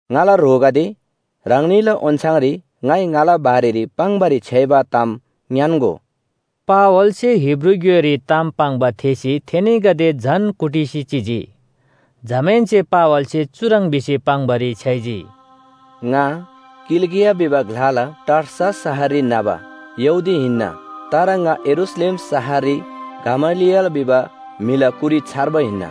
“ङाला ह्रोगदे ह्राङनीला ओन्‍छाङरी ङाइ ङाला बारेरी पाङ्‌बारी छ्‌याइबा ताम ङ्‌यान्‍गो।” पावलसे हिब्रू ग्‍योइरी ताम पाङ्बा थेःसी थेनीगदे झन कुटिसी चिजी। जमाहेन्‍से पावलसे चुह्रङ् भिसी पाङ्‌बारी छ्‌याइजी, “ङा किलिकिया भिबा ग्‍लाला टार्सस शहररी न्‍हबा यहूदी हिन्‍ना। तर ङा यरूशलेम शहररी गमलिएल भिबा म्‍हिला कुरी छर्बा हिन्‍ना।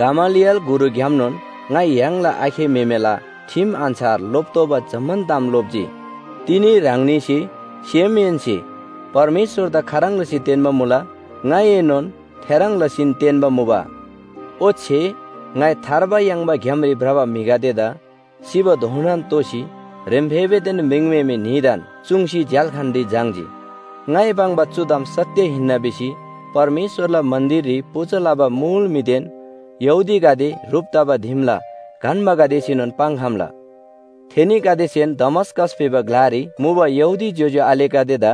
गमलिएल गुरुग्‍यामनोन ङाइ य्‍हाङला आखे म्‍हेमेला ठिम अन्‍छार लोप्‍तोःबा जम्‍मान ताम लोप्‍जी। तिनी ह्राङनीसे सेमहेन्‍से परमेश्‍वरदा खाह्रङ् लसी तेन्‍बा मुला ङाइनोन थेह्रङ् लसीन तेन्‍बा मुबा। ओच्‍छे ङाइ थार्बा याङ्बा ग्‍यामरी भ्रबा म्‍हिगदेदा सिबाधोनान तोसी ह्रेम्‍फेबेदेन म्रिङम्‍हेमे न्‍हीदान चुङ्सी झ्‍याल्‍खानरी झाङ्‌जी। ङाइ पाङ्बा चु ताम सत्‍य हिन्‍ना भिसी परमेश्‍वरला मन्‍दिररी पूजा लबा मुल म्‍हिदेन यहूदीगदे ह्रुप तबा दिमला गन्‍बागदेसेनोन पाङ्‌खम्‍ला। थेनीगदेसेन दमस्‍कस भिबा ग्‍लारी मुबा यहूदी ज्‍योज्‍यो आलेगदेदा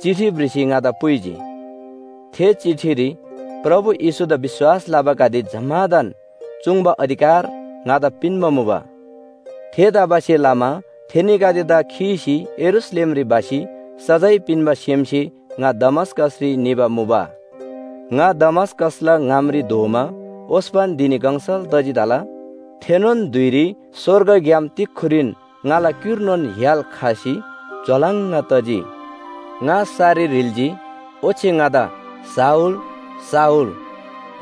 चिठी भ्रिसी ङादा पुइजी। थे चिठीरी प्रभु येशूदा विश्‍वास लबागदे जम्‍मादान चुङ्बा अधिकार ङादा पिन्‍बा मुबा। थेतबासेलमा थेनीगदेदा खीसी यरूशलेमरी भसी सजाय पिन्‍बा सेमसे ङा दमस्‍कसरी निबा मुबा। “ङा दमस्‍कसला ङामरी धोमा ओस्‍पन धिनी गङसल तजी तला, थेनोन धुइरी स्‍वर्गग्‍याम तिक्‍खुरीन ङाला क्‍युर्नोन य्‍हाल खसी झ्‍वालङ् तजी। ङा सरी ह्रिल्‍जी, ओच्‍छे ङादा ‘शाऊल, शाऊल,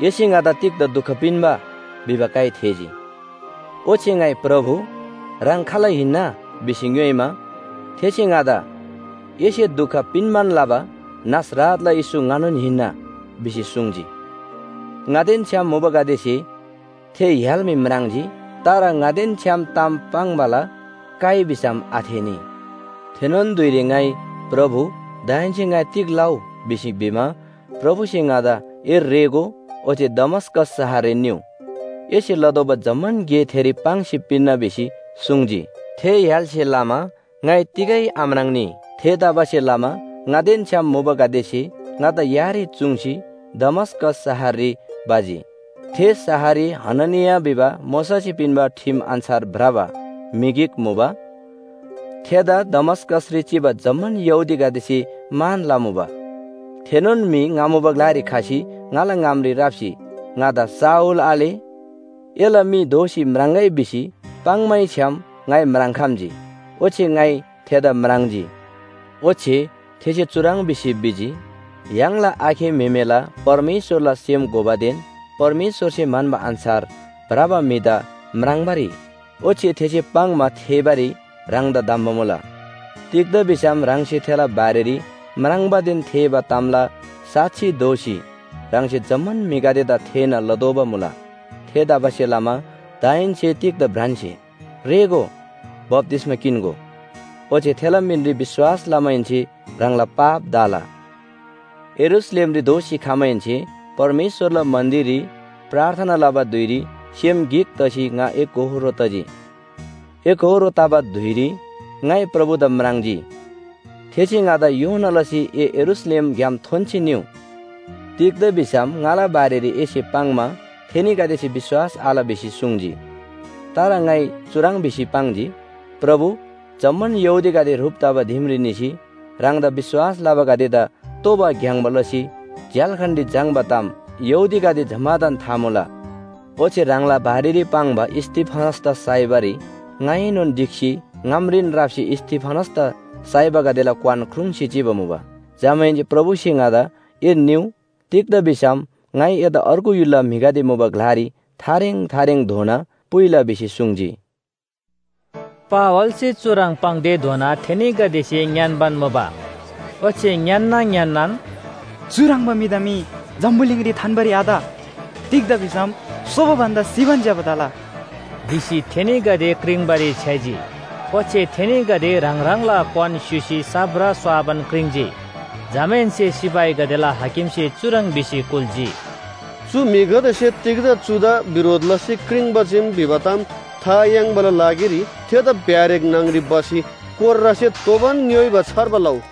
एसे ङादा तिग्‍दा दुख पिन्‍बा?’ भिबा काइ थेःजी। “ओच्‍छे ङाइ ‘प्रभु, ह्राङ खाल हिन्‍ना?’ भिसी ङ्‌योइमा, थेसे ङादा ‘एसे दुख पिन्‍बान लबा नासरतला येशू ङानोन हिन्‍ना’ भिसी सुङ्जी। ङादेन छ्‌याम मुबागदेसे थे य्‍हाल मी म्राङ्जी, तर ङादेन छ्‌याम ताम पाङ्‌बाला काइ भिसम आथेःनी। “थेनोन धुइरी ङाइ ‘प्रभु, दाहेन्‍से ङाइ तिग लउ?’ भिसी भिमा, प्रभुसे ङादा ‘ए रेःगो ओच्‍छे दमस्‍कस शहररी निउ, एसे लतोःबा जम्‍मान गे थेरी पाङ्सी पिन्‍ना’ भिसी सुङ्जी। थे य्‍हालसे लमा ङाइ तिगै आम्राङ्‌नी। थेतबासेलमा ङादेन छ्‌याम मुबागदेसे ङादा यारी चुङ्सी दमस्‍कस शहररी भजी। “थे शहररी हननिया भिबा मोशासे पिन्‍बा ठिम अन्‍छार भ्रबा म्‍हि गिक मुबा। थेदा दमस्‍कसरी चिबा जम्‍मान यहूदीगदेसे मान लमुबा। थेनोन म्‍हि ङा मुबा ग्‍लारी खसी ङाला ङामरी राप्‍सी ङादा ‘शाऊल आले, एला मी दोःसी म्राङ्‍गै’ भिसी पाङ्‌मैछ्‌याम ङाइ म्राङ्‌खम्‍जी, ओच्‍छे ङाइ थेदा म्राङ्जी। “ओच्‍छे थेसे चुह्रङ् भिसी भिजी, ‘य्‍हाङला आखे म्‍हेमेला परमेश्‍वरला सेम घोबादेन परमेश्‍वरसे म्‍हन्‍बा अन्‍छार भ्रबा म्‍हिदा म्राङ्बारी ओच्‍छे थेसे पाङ्‌मा थेःबारी ह्राङदा धम्‍बा मुला। तिग्‍दा भिसम ह्राङसे थेला बारेरी म्राङ्बादेन थेःबा तामला साक्षी दोसी ह्राङसे जम्‍मान म्‍हिगदेदा थेःना लतोःबा मुला। थेतबासेलमा दाहेन्‍से तिग्‍दा भ्रान्‍से? रेःगो, बप्‍तिस्‍मा किन्‍गो, ओच्‍छे थेला मिनरी विश्‍वास लमाहेन्‍से ह्राङला पाप धा‍ला।’ “यरूशलेमरी दोःसी खमाहेन्‍से परमेश्‍वरला मन्‍दिररी प्रार्थना लबा धुइरी सेम गिक तसी ङा एकोहोरो तजी। एकोहोरो तबा धुइरी ङाइ प्रभुदा म्राङ्जी, थेसे ङादा ‘योना लसी ए यरूशलेमग्‍याम थोन्‍सी निउ। तिग्‍दा भिसम ङाला बारेरी एसे पाङ्‌मा थेनीगदेसे विश्‍वास आल’ भिसी सुङ्जी। “तर ङाइ चुह्रङ् भिसी पाङ्जी, ‘प्रभु, जम्‍मान यहूदीगदे ह्रुप तबा दिमरी निसी ह्राङदा विश्‍वास लबागदेदा तोबा ग्‍याङ्‍बा लसी झ्‍याल्‍खानरी झाङ्‌बा ताम यहूदीगदे जम्‍मादान था मुला। ओच्‍छे ह्राङला बारेरी पाङ्बा स्‍तिफनसदा साइबारी ङाएनोन ढिक्‍सी ङामरीन राप्‍सी स्‍तिफनसदा साइबागदेला क्‍वान ख्रुङ्‌सी चिबा मुबा।’ “जमाहेन्‍से प्रभुसे ङादा ‘ए निउ, तिग्‍दा भिसम ङाइ एदा अर्गु य्‍हुलला म्‍हिगदे मुबा ग्‍लारी थारेङ थारेङधोना पुइला’ भिसी सुङ्जी।” पावलसे चुह्रङ् पाङ्‌तेधोना थेनीगदेसे ङ्‌यान्‍बान मुबा, ओच्‍छे ङ्‌यान्‍ना ङ्‌यान्‍नान “चुह्रङ्बा म्‍हिदा मी जम्‍बुलिङरी थान्‍बारी आत। तिग्‍दा भिसम सोबा भन्‍दा सिबान ज्‍यबा तला” भिसी थेनीगदे क्रिङ्बारी छ्‌याइजी। ओच्‍छे थेनीगदे ह्राङ ह्राङला क्‍वान स्‍युसी साप्रा स्‍वाबान क्रिङ्‌जी। जमाहेन्‍से सिपाहीगदेला हाकिमसे चुह्रङ् भिसी कुल्‍जी, “चु म्‍हिगदेसे तिग्‍दा चुदा बिरोध लसी क्रिङ्‌बा चीम भिबा ताम था याङ्बाला लागिरी थेदा ब्‍यारेक न्‍हङरी भसी कोर्रासे तोबान ङ्‌योइबा छार्बा लउ।”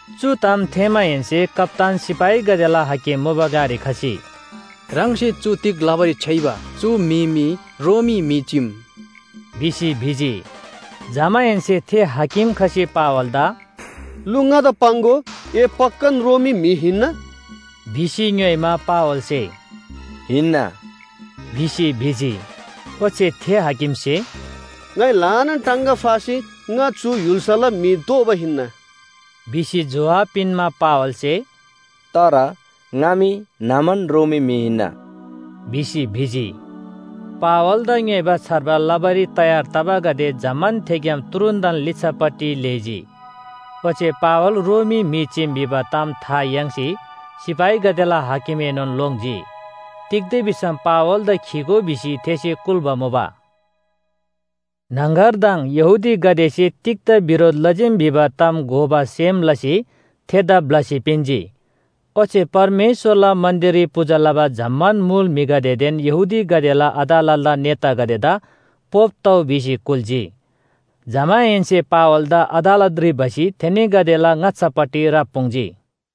चु ताम थेःमाहेन्‍से कप्‍तान सिपाहीगदेला हाकिम मुबा ग्‍लारी खसी, “ह्राङसे चु तिग लबारी छ्‌याइबा? चु म्‍हि मी रोमी म्‍हि चीम” भिसी भिजी। जमाहेन्‍से थे हाकिम खसी पावलदा “लु, ङादा पाङ्‍गो, ए पक्‍कान रोमी म्‍हि हिन्‍ना?” भिसी ङ्‌योइमा पावलसे “हिन्‍ना” भिसी भिजी। ओच्‍छे थे हाकिमसे “ङाइ ल्‍हानान टाङगा फासी ङा चु य्‍हुल्‍साला म्‍हि दोबा हिन्‍ना” भिसी जोहाब पिन्‍मा, पावलसे “तर ङा मी न्‍हमान रोमी म्‍हि हिन्‍ना” भिसी भिजी। पावलदा ङ्‌योइबा छार्बा लबारी तयार तबागदे जम्‍मान थेग्‍याम तुरुन्‍तन लिच्‍छापट्टि लेःजी। ओच्‍छे पावल रोमी म्‍हि चीम भिबा ताम था याङ्सी सिपाहीगदेला हाकिमएनोन लोङ्जी। तिग्‍दा भिसम पावलदा खीगो भिसी थेसे कुल्‍बा मुबा। न्‍हङगरदङ यहूदीगदेसे तिग्‍दा बिरोध लजीम भिबा ताम घोबा सेम लसी थेदा ब्‍लसी पिन्‍जी। ओच्‍छे परमेश्‍वरला मन्‍दिररी पूजा लबा जम्‍मान मुल म्‍हिगदेदेन यहूदीगदेला अदालतला नेतागदेदा पोप तउ भिसी कुल्‍जी। जमाहेन्‍से पावलदा अदालतरी भसी थेनीगदेला ङाच्‍छापट्टि राप्‍पुङ्जी।